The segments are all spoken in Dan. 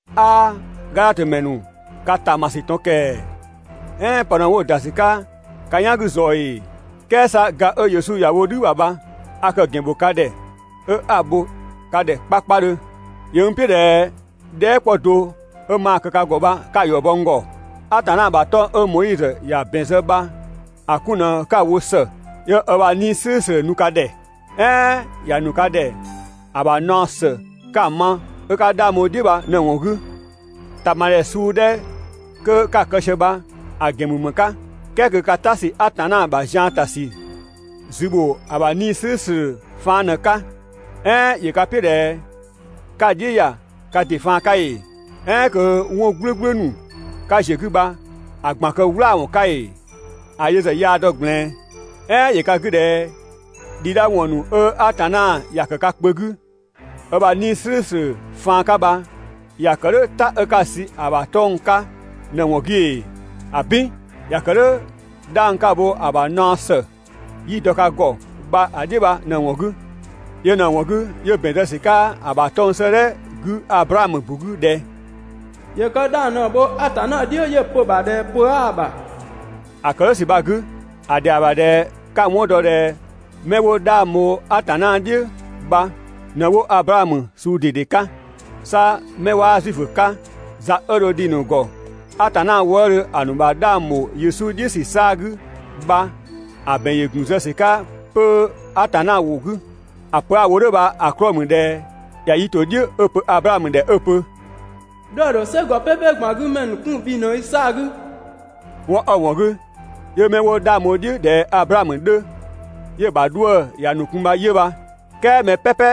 'Aa, Gadhatö ‑mɛ ‑nu, ka ‑ta ‑ma ‑sü ꞊tɔn ‑kɛɛ! "Ɛɛn pë ꞊në 'wo‑ ‑da ‑sü 'ka ka "yan 'gü ꞊zɔɔ ‑ee? "Kɛɛ 'sa ga 'ö Yesu ‑ya wo "dhü ‑bha bha a kë‑ ‑gɛn bho ka ‑dhɛ 'ö 'a‑ bho ka ‑dhɛ 'ko ‑ta 'kpakpadhö. ‑Yö n "piʋ̈ ꞊dhɛ dhɛɛ" 'kpɔ do 'ö maa‑ kë ka ‑gɔ bha 'ka‑ ‑yɔ bɔ n ‑gɔ. Atanna ‑bha 'tɔng‑ 'ö Moizö ‑ya ‑bɛn zë bha‑ 'kun ꞊në 'ka‑ wo ‑së 'yö ö ‑bha 'Nii‑ "slʋ̈ʋ̈slʋ̈ nu ka ‑dhɛ, "ɛɛn ‑ya ‑nu ka ‑dhɛ ‑a ‑bha naɔ ‑së 'ka‑ ma 'ö 'ka 'dhang bho‑ "dhiʋ̈ bha ꞊në‑ ‑wɔn 'gü? ‑Tama ‑dhɛ suu 'dhɛ 'kö 'ka‑ kë sië bha‑ kë ‑gɛn ‑mü ‑më 'ka "kɛɛ kö ka "ta ‑sü Atanna ‑bha zian ‑ta ‑sü zü ‑bho ‑a ‑bha 'Nii‑ "slʋ̈ʋ̈slʋ̈ faan ꞊në‑ 'ka? "Ɛɛn ‑yö ka "piʋ̈ ꞊dhɛ 'ka‑ "dhiʋ̈ ‑ya ka ‑dɩ faan 'ka ‑ee? "Ɛɛn kö 'wɔn "gblʋ̈gblʋ̈ ‑nu 'ka ‑ziö 'gü bha‑ ꞊gban‑ kë "wlaawɔn 'ka ‑ee? ‑A yö ‑zë yaa‑ dɔ ꞊gblɛɛn. "Ɛɛn ‑yö ka 'gü ꞊dhɛ "dhabhliwɔn ‑nu 'ö Atanna ‑ya ‑kë ka kpö 'gü ö ‑bha 'Nii‑ "slʋ̈ʋ̈slʋ̈ faan 'ka bha ‑ya kë "dhʋ̈ "ta 'ka‑ sü ‑a ‑bha 'tɔng‑ 'ka ꞊në‑ ‑wɔn 'gü ‑ee? ‑Abin! ‑Ya ‑kë "dhʋ̈ 'dhang 'ka‑ bho‑ ‑bha naɔ ‑së ('yi‑ dɔ ka ‑gɔ) bha‑ "dhiʋ̈ bha ꞊në‑ ‑wɔn 'gü. Yö ꞊në‑ ‑wɔn 'gü 'yö ‑bɛn zë ‑sü 'ka ‑a ‑bha 'tɔng‑ 'sëëdhɛ 'gü Ablaamö ‑bu 'gü ꞊dhɛ: «‑Yö kë 'dhang ꞊në‑ bho Atanna "dhiʋ̈ 'yö‑ pö‑ ‑bha ꞊dhɛ pö 'aa‑ ‑bha.» ‑A ‑kë "dhʋ̈ ‑sü bha‑ 'gü, ‑a ‑dhɛa ‑bha ꞊dhɛ 'ka‑ 'wɔn dɔ ꞊dhɛ 'mɛ 'wo 'dhang bho Atanna "dhiʋ̈ bha ꞊në 'wo Ablaamö suu ꞊dede 'ka. 'Sa 'mɛ 'waa Zuifö 'ka za 'ö dho dhi‑ ‑nu ‑gɔ Atanna wëëdhö ‑a ‑nu ‑bha 'dhang ‑bho Yesu "dhiʋ̈ ‑sü 'saa‑ 'gü bha‑ ‑bɛn ‑yö ‑gun zë ‑sü 'ka 'pö Atanna ‑wʋ 'gü. ‑A pö 'a‑ wo "dhʋ̈ bha‑ 'klɔɔ‑ ‑mü ꞊dhɛ ‑ya yi ‑to "dhiʋ̈ 'ö‑ pö Ablaamö ‑dhɛ 'ö‑ pö: «'Dhuë‑ ‑dho "sɛgɔ "pɛpɛ ꞊gban 'gü ‑mɛ ‑nu 'kun bhi ꞊në i 'saa‑ 'gü!» 'Wɔn 'ö‑ ‑wɔn 'gü 'yö 'mɛ 'wo 'dhang bho‑ "dhiʋ̈ ꞊dhɛ Ablaamö 'dhö, 'yö‑ ‑bha 'dhuë‑ ‑ya ‑nu kun bha 'yö bha. "Kɛɛ mɛ "pɛpɛ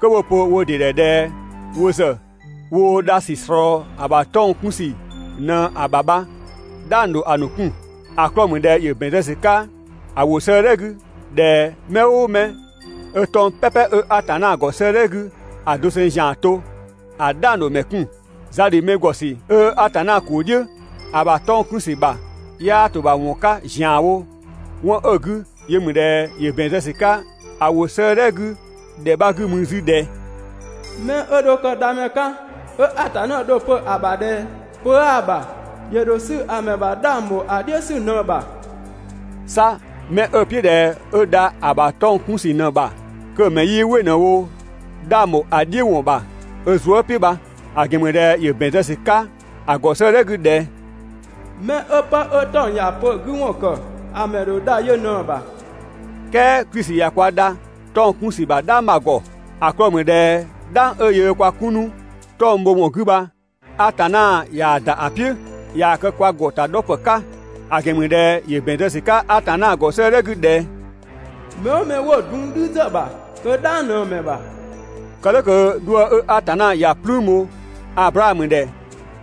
'kö 'wo‑ pö wo ‑dɩ ‑dhɛ ꞊dhɛ wo ‑zë woo dha ‑sü ꞊slɔɔ‑ ‑bha 'tɔng‑ 'kun ‑sü ꞊në‑ ‑bha bha "dhang ‑dho ‑a ‑nu 'kun. ‑A 'klɔɔ‑ ‑mü ꞊dhɛ ‑yö ‑bɛn zë ‑sü 'ka‑ ‑wʋ 'sëëdhɛ 'gü ꞊dhɛ mɛ "ʋʋ mɛ 'ö 'tɔng‑ "pɛpɛ 'ö Atanna ‑gɔ 'sëëdhɛ 'gü ‑a doseng ‑zian to, ‑a "dhang ‑dho ‑mɛ 'kun. Za ‑dhi mɛ ‑gɔ ‑sü 'ö Atanna ‑kuu "dhiʋ̈ ‑a ‑bha 'tɔng‑ 'kun ‑sü ‑bha 'yaa ‑to ‑bha ‑wɔn 'ka ‑zianwo 'wɔn 'ö‑ 'gü yö ‑mü ꞊dhɛ, ‑yö ‑bɛn zë ‑sü 'ka‑ ‑wʋ 'sëëdhɛ 'gü ‑dhɛ 'bha 'gü mü 'zü ꞊dhɛ: «'Mɛ 'ö dho kë Dhamɛ 'ka, 'ö Atanna dho‑ pö‑ ‑bha ꞊dhɛ pö 'aa‑ ‑bha, ‑yö ‑dho 'sü ‑a ‑mɛ ‑bha 'dhang ‑bho ‑a "dhiʋ̈ ‑sü ꞊në‑ ‑bha.» 'Sa 'mɛ 'ö‑ "piʋ̈ ꞊dhɛ 'ö dha ‑a ‑bha 'tɔng‑ 'kun ‑sü ꞊në‑ ‑bha, kö‑ ‑mɛ 'yii "wɩ ꞊në‑ wo 'dhang ‑bho ‑a "dhiʋ̈ ‑wɔn ‑bha ö zuë" "piʋ̈ bha. ‑A ‑gɛn ‑mü ꞊dhɛ ‑yö ‑bɛn zë ‑sü 'ka ‑a ‑gɔ 'sëëdhɛ 'gü ꞊dhɛ: «'Mɛ 'ö pë 'ö 'tɔng‑ ‑ya pö‑ 'gü ‑wɔn ‑kë, ‑a ‑mɛ ‑dho dha yö ꞊në‑ ‑bha.» "Kɛɛ Klisi ꞊ya kwa dha 'tɔng‑ 'kun ‑sü ‑bha "dhang bha‑ ‑gɔ. ‑A 'klɔɔ‑ ‑mü ꞊dhɛ "dhang 'ö yöö kwa 'kun 'nu 'tɔng‑ bho ‑wɔn 'gü bha Atanna yaa‑ ‑da ‑a "piʋ̈, ꞊yaa‑ kë kwa ‑gɔ ‑ta 'dhɔ ‑pë 'ka. ‑A ‑gɛn ‑mü ꞊dhɛ ‑yö ‑bɛn zë ‑sü 'ka Atanna ‑gɔ 'sëëdhɛ 'gü ꞊dhɛ: «Mɛ "ʋʋ mɛ 'wo‑ dun "dhü ‑zë ‑bha, kö "dhang ꞊në‑ ‑mɛ ‑bha.» Kë "dhʋ̈ kö 'dhuë‑ 'ö Atanna ‑ya "plüün bho Ablaamö ‑dhɛ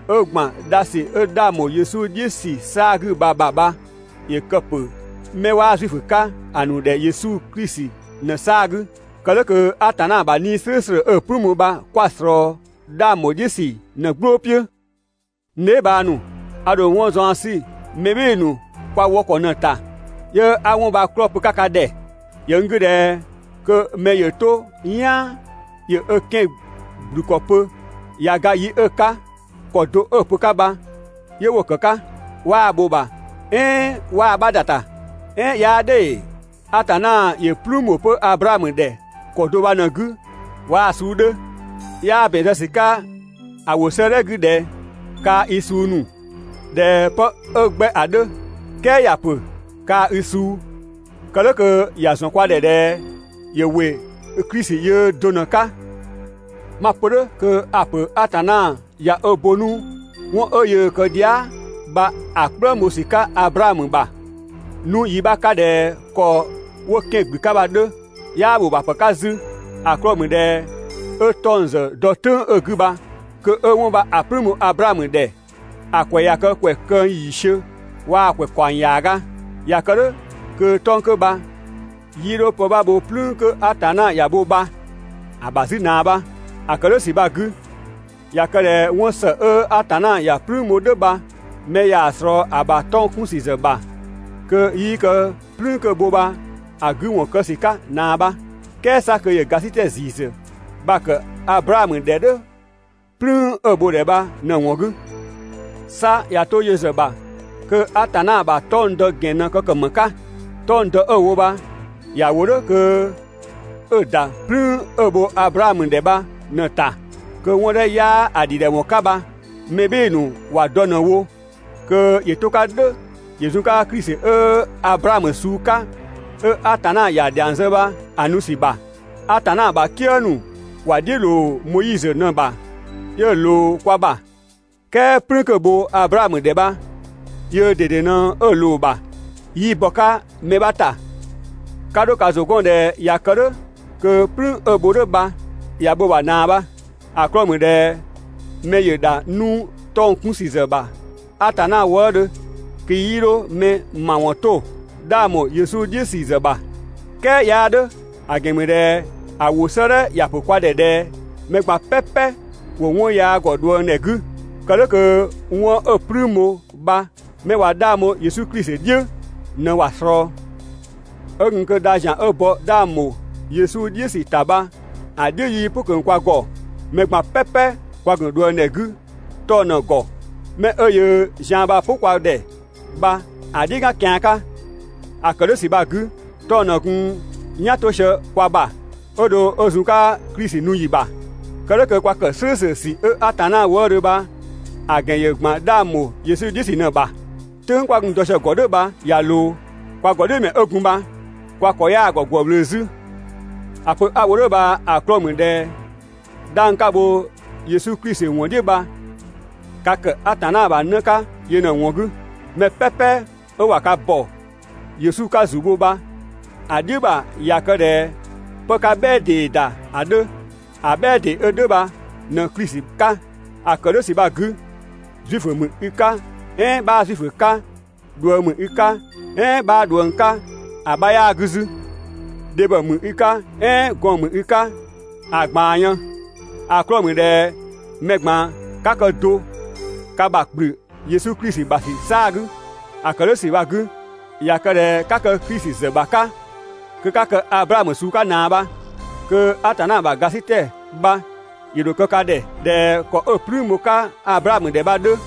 ('ö ‑gban dha ‑sü 'ö 'dhang ‑bho Yesu "dhiʋ̈ ‑sü 'saa‑ 'gü bha‑ ‑bha) bha ‑yö kë 'pö 'mɛ 'waa Zuifö 'ka‑ ‑nu ‑dhɛ Yesu Klisi ꞊në‑ 'saa‑ 'gü, kë "dhʋ̈ kö Atanna ‑bha 'Nii‑ "slʋ̈ʋ̈slʋ̈ 'ö‑ "plüün bho bha 'kwa‑ ꞊slɔɔ 'dhang ‑bho "dhiʋ̈ ‑sü ꞊në‑ "gblʋʋ "piʋ̈. N dheebhang ‑nu, a ‑dho 'wɔn zaɔn 'sü mɛ "bhɩɩ‑ ‑nu kwa wɔ ‑kɔ ꞊në‑ ‑ta 'yö 'a 'wɔn bha‑ 'klɔɔ‑ pö‑ 'ka ka ‑dhɛ. ‑Yö n 'gü ꞊dhɛ kö mɛ ‑yö 'to "yaan ‑yö ö 'kɛan‑ ‑gblü ‑kɔ pö, ꞊ya ga yi 'ö‑ 'ka, ‑kɔ do 'ö‑ pö‑ 'ka bha 'yö 'wo‑ ‑kë 'ka, 'waa‑ bho‑ ‑bha "ɛɛn 'waa‑ 'bha ‑da ‑ta. "Ɛɛn 'yaa "dhʋ̈ ‑ee? Atanna ‑yö "plüün ‑bho 'pö Ablaamö ‑dhɛ ‑kɔ do bha ꞊në‑ 'gü waa‑ suu 'dhö. 'Yaa ‑bɛn zë ‑sü 'ka ‑a ‑wʋ 'sëëdhɛ 'gü ꞊dhɛ: «Kaa‑ i suu ‑nu», ꞊dhɛ pë 'ö 'gbɛ ‑a 'dhö, "kɛɛ ‑ya ‑pö: «Kaa‑ i suu». Kë "dhʋ̈ kö ‑ya ‑zɔn kwa ‑dhɛ ꞊dhɛ ‑yö ‑wɩ Klisi yöö do ꞊në‑ 'ka. 'Ma‑ pö "dhʋ̈ kö a‑ ‑pö Atanna ꞊ya ö bo 'nu 'wɔn 'ö yöö kë dhia" bha‑ "kplëng bho ‑sü 'ka Ablaamö ‑bha 'nu yi 'bha 'ka ꞊dhɛ ‑kɔ 'wo 'kɛan‑ ‑gblü 'ka bha‑ 'dhö, 'yaa ‑bho ‑bha ‑pë 'ka 'zü, ‑a 'klɔɔ‑ ‑mü ꞊dhɛ 'ö 'tɔng‑ ‑zë dɔ "tʋ̈ng 'ö‑ 'gü bha kö 'ö 'wɔn bha‑ "plüün bho Ablaamö ‑dhɛ ‑a ‑kwɛ ꞊ya kë ‑kwɛ këng ‑yiisiö waa‑ ‑kwɛ ‑kaɔng ‑yaaga. ꞊Ya kë "dhʋ̈ kö 'tɔng‑ 'kö bha 'yii 'dho pë 'bha bho "plüün 'kö Atanna ‑ya bho bha‑ ‑bha 'zü ꞊naa bha. ‑A ‑kë "dhʋ̈ ‑sü bha‑ 'gü, ꞊ya kë ꞊dhɛ 'wɔn ‑së 'ö Atanna ‑ya "plüün bho "dhʋ̈ bha mɛ ꞊yaa‑ ꞊slɔɔ‑ ‑bha 'tɔng‑ 'kun ‑sü ‑zë ‑bha, kö 'yii kë "plüün 'kö‑ bho bha‑ 'gü ‑wɔn kë ‑sü 'ka ꞊naa bha. "Kɛɛ 'sa kö ‑yö ‑gasitɛ ‑ziisü bha‑ ‑kë Ablaamö ‑dhɛ "dhʋ̈ "plüün 'ö‑ bho‑ ‑dhɛ bha ꞊në‑ ‑wɔn 'gü. 'Sa ꞊ya 'to yö ‑zë ‑bha kö Atanna ‑bha 'tɔng‑ dɔ ‑gɛn ꞊në kë ‑kë ‑më 'ka? 'Tɔng‑ dɔ 'ö‑ wo bha ‑ya ‑wo "dhʋ̈ kö 'ö‑ ‑da ("plüün 'ö‑ bho Ablaamö ‑dhɛ bha ꞊në‑ ‑ta) kö 'wɔn 'dhɛ 'ö 'yaa‑ ‑dhidhɛwɔn 'ka bha mɛ "bhɩɩ‑ ‑nu ‑wa dɔ ꞊në‑ wo, kö ‑yö 'to‑ 'ka "dhʋ̈ ‑yö zun‑ 'ka Klisi 'ö Ablaamö suu 'ka 'ö Atanna ‑ya ‑dhiang zë bha‑ nu ‑sü ‑bha. Atanna ‑bha "kië ‑nu ‑wa "dhiʋ̈ ‑loo Moizö ꞊në‑ ‑bha 'yö‑ ꞊loo kwa ‑bha. ("Kɛɛ "plüün 'kö‑ bho Ablaamö ‑dhɛ bha) yöö ꞊dede ꞊në‑ ꞊loo‑ ‑bha, 'yii bɔ‑ 'ka mɛ 'bha ‑ta. 'Ka 'dho ka ‑zʋ 'gɔn ꞊dhɛ ꞊ya kë "dhʋ̈ kö "plüün 'ö‑ bho "dhʋ̈ bha ꞊ya bho‑ ‑bha ꞊naa bha. ‑A 'klɔɔ‑ ‑mü ꞊dhɛ mɛ‑ ‑dha 'nu 'tɔng‑ 'kun ‑sü ‑zë ‑bha Atanna wëëdhö kö 'yii 'dho mɛ ‑mawɔn 'to 'dhang ‑bho Yesu "dhiʋ̈ ‑sü ‑zë ‑bha. "Kɛɛ 'yaa "dhʋ̈. ‑A ‑gɛn ‑mü ꞊dhɛ ‑a ‑wʋ 'sëëdhɛ ‑ya ‑pö kwa ‑dhɛ ꞊dhɛ mɛ ꞊gban "pɛpɛ ‑wo 'wɔn yaa ‑gɔ ꞊dhuëngdhɛ 'gü, kë "dhʋ̈ kö 'wɔn 'ö‑ "plüün bho bha 'mɛ ꞊wa 'dhang bho Yesu Klisi "dhiʋ̈ ꞊në ‑wa ꞊slɔɔ. 'Ö gun kö dha ‑zian 'ö bɔ 'dhang ‑bho Yesu "dhiʋ̈ ‑sü ‑ta bha‑ "dhiʋ̈ 'yii "pʋ ꞊kö kwa ‑gɔ, mɛ ꞊gban "pɛpɛ kwa ‑gun ꞊dhuëngdhɛ 'gü 'tɔng‑ ꞊në‑ ‑gɔ, 'mɛ 'ö yöö zian bha‑ "pʋ kwa ‑dhɛ bha‑ "dhiʋ̈ "gan kian 'ka. ‑A ‑kë "dhʋ̈ ‑sü bha‑ 'gü, 'tɔng‑ ꞊në gun "yan 'to sië kwa ‑bha 'ö dho 'ö zun‑ 'ka Klisi nu ‑yi ‑bha, kë "dhʋ̈ kö kwa ‑kë "slʋ̈ʋ̈slʋ̈ ‑sü 'ö Atanna wëëdhö bha‑ ‑gɛn ‑yö ‑gban 'dhang ‑bho Yesu "dhiʋ̈ ‑sü ꞊në‑ ‑bha. "Tʋ̈ng 'kwa gun dɔ sië‑ ‑gɔ "dhʋ̈ bha ꞊ya ꞊loo, kwa ‑gɔdhiʋ̈mɛ 'ö gun bha kwa ‑kɔ 'yaa‑ ‑gɔ ‑gwë ꞊wlöö 'zü. ‑A pö 'a‑ wo "dhʋ̈ bha‑ 'klɔɔ‑ ‑mü ꞊dhɛ 'dhang 'ka‑ bho Yesu Klisi ‑wɔn "dhiʋ̈ bha ka ‑kë Atanna ‑bha 'në 'ka yö ꞊në‑ ‑wɔn 'gü. Mɛ "pɛpɛ 'ö ꞊wa ka ‑bɔ Yesu 'ka ‑zu bho bha‑ "dhiʋ̈ ‑bha ꞊ya kë ꞊dhɛ 'pë 'ka "bhɛɛ ‑dee ‑da ‑a 'dhö. ‑A "bhɛɛ ‑dee 'ö "dhʋ̈ bha ꞊në Klisi 'ka. ‑A ‑kë "dhʋ̈ ‑sü bha‑ 'gü, Zuifö ‑mü i 'ka "ɛɛn 'bhaa Zuifö 'ka, ꞊dhuëng ‑mü i 'ka "ɛɛn 'bhaa ꞊dhuëng 'ka, ‑a 'bha 'yaa‑ 'gü 'zü. Dhebhɔ ‑mü i 'ka "ɛɛn gɔɔn‑ ‑mü i 'ka, ‑a ꞊gbaan yën, ‑a 'klɔɔ‑ ‑mü ꞊dhɛ mɛ ꞊gban 'ka kë do ka ‑bha ‑kplü Yesu Klisi ‑bha ‑sü 'saa‑ 'gü. ‑A ‑kë "dhʋ̈ ‑sü bha‑ 'gü, ꞊ya kë ꞊dhɛ 'ka kë Klisi ‑zë ‑bha 'ka, kö 'ka kë Ablaamö suu 'ka ꞊naa bha, kö Atanna ‑bha ‑gasitɛ bha ‑yö ‑dho kë ka ‑dhɛ ꞊dhɛ ‑kɔ 'ö‑ "plüün bho‑ 'ka Ablaamö ‑dhɛ bha‑ 'dhö.